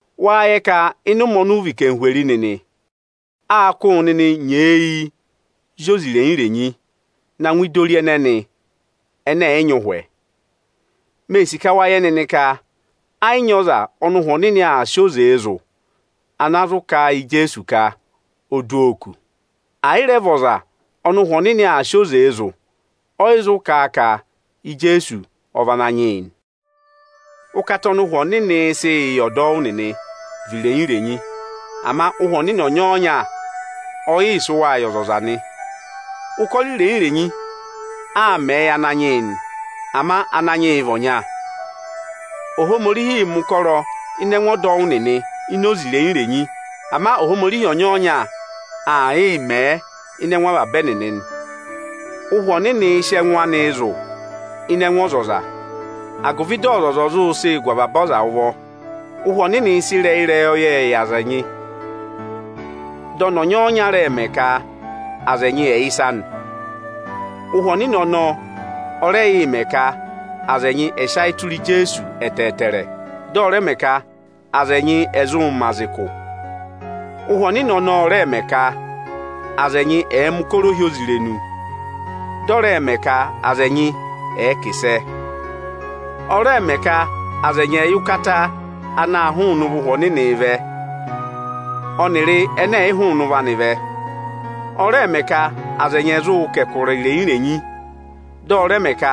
Wâ yẹ ka ịnị ụmẹ ọnị ụ vị anarịmadọwụ nịnị, â kụ́ wụ nịnị nyeeyi zị oze irenyi-irenyi na ngụ ịdị ori ẹnẹnị ẹnẹ ẹ̀ yị nyị ụhwẹ. Mee sì ka wa yẹ nịnị ka ẹ yị nyị ọza ọnị Ụhwẹ Ohomorihi aa sị oze zụ̀ ana zụ kà a yị Ijeesu ka o du oo kù. Ẹ̀ yị rẹ vị ọza ọnị Ụhwẹ Ohomorihi aa si oze zụ̀, ọ yị zụ kà a ka Ijeesu ọ vị Ananyị yị nị. Ụkata ọnị Ụhwẹ Ohomorihi sịị yị ọdọwụ nịnị vị irenyi-renyi. Ama Ụhwẹ Ohomorihi ọnyọọnya ọ yị sị wa yị ọzọza nị. Ụkọrọ irenyi-irenyi aa mẹẹ yị Ananyị yị nị, ama Ananyị yị vị ọnya. Ohomorihiī mẹ̀ ụkọrọ ịnị ẹngụ ọdọwụ nịnị ini oze irenyi-renyi, ama Ohomorihi ọnyọọnya aa yịị mẹ̀ ẹ ịnị ẹngụ avaba ẹnịnị nị. Ụhwẹ Ohomorihiī sị ẹngụ anịị zụ̀ ịnị ẹngụ ọzọza, agụvị dị ọzọza ọ̀ zụ sịị gụ avaba aza ụvọ. Ụhwẹ Ohomorihi sị ịrẹyị ịrẹyọyẹẹ yị aza ẹnyị, dị ọnị ọnyọọnya rẹ mẹ ka aza ẹnyị ẹ̀ yẹ ịsa nị. Ụhwẹ Ohomorihi ọnọọ ọ rẹ yị mẹ ka aza ẹnyị ẹ̀ sị ayị tụra Ijeesu ẹtẹẹtẹrẹ, dị ọ rẹ mẹ ka aza ẹnyị ẹ̀ zụụ̄ mẹ aza ụkụ. Ụhwẹ Ohomorihi ọnọọ ọ rẹẹ̄ mẹ ka aza ẹnyị ẹ̀ẹ mẹ̀ ụkọrọ ohyozirenu, dị ọ rẹ mẹ ka aza ẹnyị ẹnị ẹ̀ẹ kà ịsẹ. Ọ rẹẹ̄ mẹ ka aza ẹnyị ẹ̀ẹ yẹ ụkata ana àa hụụnị ụvọ Ụhwẹ Ohomorihi vẹ ọnịrị ẹnẹ ẹ̀ yị hụụnị ụvọ anị vẹ. Ọ rẹẹ̄ mẹ ka aza ẹnyị ẹ̀ zụụ kà ẹkụra irenyi-renyi, dị ọ rẹ mẹ ka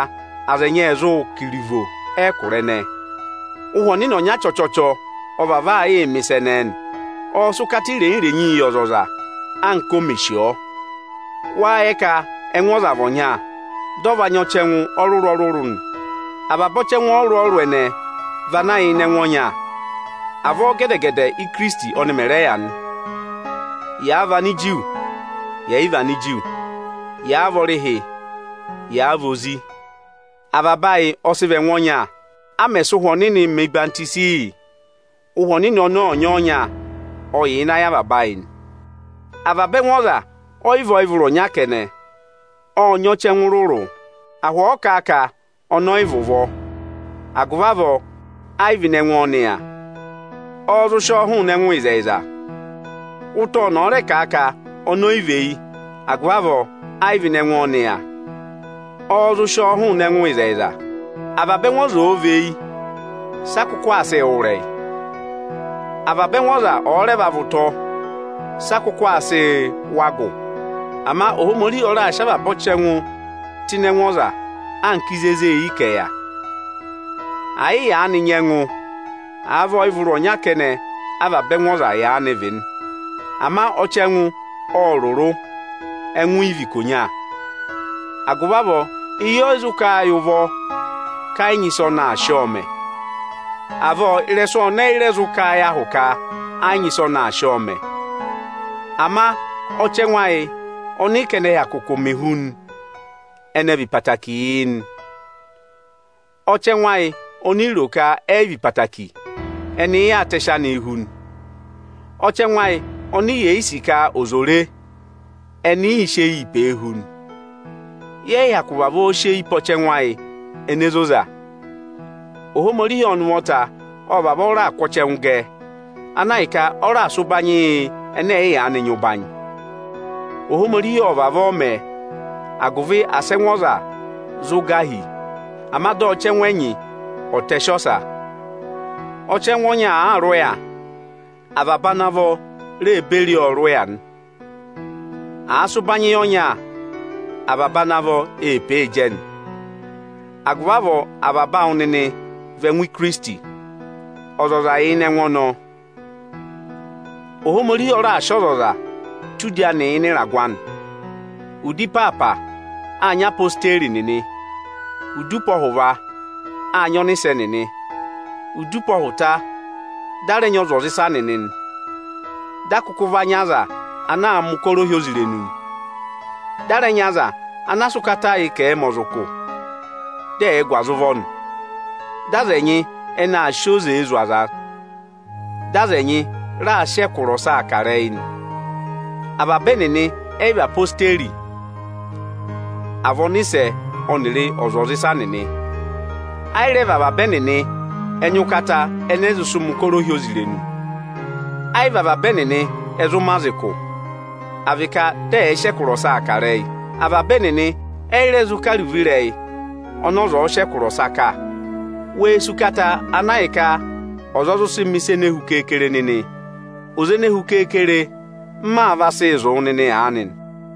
aza ẹnyị ẹnị ẹ̀ zụụ̄ kà iruvo ẹkụra ẹnẹẹ nị. Ụhwẹ Ohomorihi ọnya chọchọchọ̀ ọ vavọọ aa yịị mẹ̀ ịsa ẹnẹẹ nị. Ộ sị ụkata irenyi-renyii yị ọzọza, anka o mè sì ọọ. Wâ yẹ ka ẹngụ ọza vị ọnya, dị ọ va nyị ọchẹngụ ọrụrụ-ọrụrụ nị. Avaba ọchẹngụ ọrụrụ-ọrụrụ ẹnẹẹ vị ana yà ịnị ẹngụ ọnya. Avọọ gẹdẹ-gẹdẹ Ikirisiti ọnị mẹ̀ rẹ yà nị. Yàa vị Aniju, yẹ̀ yị vị Aniju, yàa vị ọrịhị, yàa vị ozi; avaba ayị ọ sị vị ẹngụ ọnya, a mẹ̀ sị Ụhwẹ Ohomorihi mẹ̀ ọyịhwọzenyi yị. Ụhwẹ Ohomorihi ọnọọ ọnyọọnya ọ yà ịnị ayị avaba ayị nị. Avaba ẹngụ ọza ọ yị vị ọyịvụrụ ọnya kẹnẹ. Ộ nyị ọchẹngụ rụrụ. Ahụ ọ̀ọ kà a ka ọnị ọ yị vị ụvọ, agụvị avọọ ẹ yị vị ịnị ẹngụ ọnị yà, ọ́ọ́ zụ sị ọọ hụụnị ẹngụ ịzẹyịza? Ụtọ ọnị ọ̀ọ rẹ kà a ka ọnị ọ yị vị eyi, agụvị avọọ ẹ yị vị ịnị ẹngụ ọnị yà, ọ́ọ́ zụ sị ọọ hụụnị ẹngụ ịzẹyịza? Avaba ẹngụ ọza ọ̀ọ vị eyi, sị a kụkụ aa sịị wụ́ ịrẹyị? Avaba ẹngụ ọza ọ̀ọ rẹ va vị ụtọ, sị a kụkụ aa sịị wụ́ agụ? Ama Ohomorihi ọ raà sị avaba ọchẹngụ tụ́ ịnị ẹngụ ọza anka ịzị e zée eyi ka ẹ̀ yà. Ẹ yị yaanị nyị ẹngụ àa vị ọyịvụrụ ọnya kẹnẹ avaba ẹngụ ọza yaanị vị nị. Ama ọchẹngụ ộ rụrụ, ẹngụ yị vị ikonya. Agụvị avọọ eyi ọ yị zụ kà a yị ụvọ ka ẹ yị nyị ịsị ọnị aa sị ọọ mẹ. Avọọ, ịrẹsụ ọnị ọyị rẹ zụ kà a yị ahụ ka ẹ yị nyị ịsị ọnị aa sị ọọ mẹ. Ama ọchẹngụ ẹyị ọnị ị ka ẹnị ẹ hyakụ kụmị hu nị, ẹnị ẹ vị ịsa okuku yị yị nị. Ọchẹngụ ayị oni i ro ka ẹ yị vị okuku, ẹnị ị yaa tẹsị anịị hu nị. Ọchẹngụ ayị ọnị yè yị sì ka ọza ò re, ẹnị ị sị eyii pee hu nị. Yẹ yị hyakụ vavọọ sị eyi pe ọchẹngụ ayị ene zoza. Ohomorihi ọnị ụvọta ộ vavọọ raà kụ́ ọchẹngụ gẹ, ana ahịka ọ raà sị ụbanyị yị ẹnẹ ẹ̀ yị yaanị nyị ụbanyị. Ohomorihi ộ vavọọ mẹẹ, agụvị asị ẹngụ ọza zụ gà hi, ama dị ọchẹngụ ẹnyị ọ̀ọ tẹsị ọsa. Ọchẹngụ ọnya àaa rị ụya, avaba ana vọ e ree beri ọọ rị ụya nị. Àa sị ụbanyị yị ọnya, avaba ana vọ ee pee jẹ nị. Agụvị avọọ avaba awụ nịnị vị ẹngụ Ikirisiti, ọzọza yà ịnị ẹngụ ọnọọ. Ohomorihi ọ raà sị ọzọza tụ́ udi anị ịnị ịragụ anị. Udi ịpaapa, áa nyị Ezirẹma Ijeesu nịnị; udi ụpọhụva, áa nyị ọnịsẹ nịnị. Udi ụpọhụta, dị a rẹ nyị ọzwọzịsa nịnị nị. Dị a kụkụ va nyị aza ana aa mẹ̀ ụkọrọ ohyozirenu nị, dị a rẹ nyị aza anaa sị ụkata yị ka ẹ̀ẹ mẹ aza ụkụ, dị ẹ̀ẹ gụ aza ụvọ nị. Dị aza ẹnyị ẹnị aa sị oze zụ̀ aza; dị aza ẹnyị raa sị ẹkụra ọsaa kà ịrẹyị nị. Avaba ẹnịnị ẹ yị vị Ezirẹma Ijeesu, à vị ọnịsẹ ọnịrị ọzwọzịsa nịnị. Ẹ yị rẹ vị avaba ẹnịnị ẹ nyị ụkata ẹnẹ ẹ zụ sị mẹ̀ ụkọrọ ohyozirenu. Ẹ yị vị avaba ẹnịnị ẹ zụ mẹ aza ụkụ, à vị ka dị ẹ̀ẹ sị ẹkụra ọsaa kà ịrẹyị. Avaba ẹnịnị ẹ yị rẹ zụ kà iruvo ịrẹyị ọnị ọza ọ̀ọ sị ẹkụra ọsa kà. Wee sì ụkata ana ahịka ọza ọ zụ sị mẹ̀ ịsa ene hu keekere nịnị! Oze ene hu keekere m maa vaa sịị zụ̀ wụ aanị nị.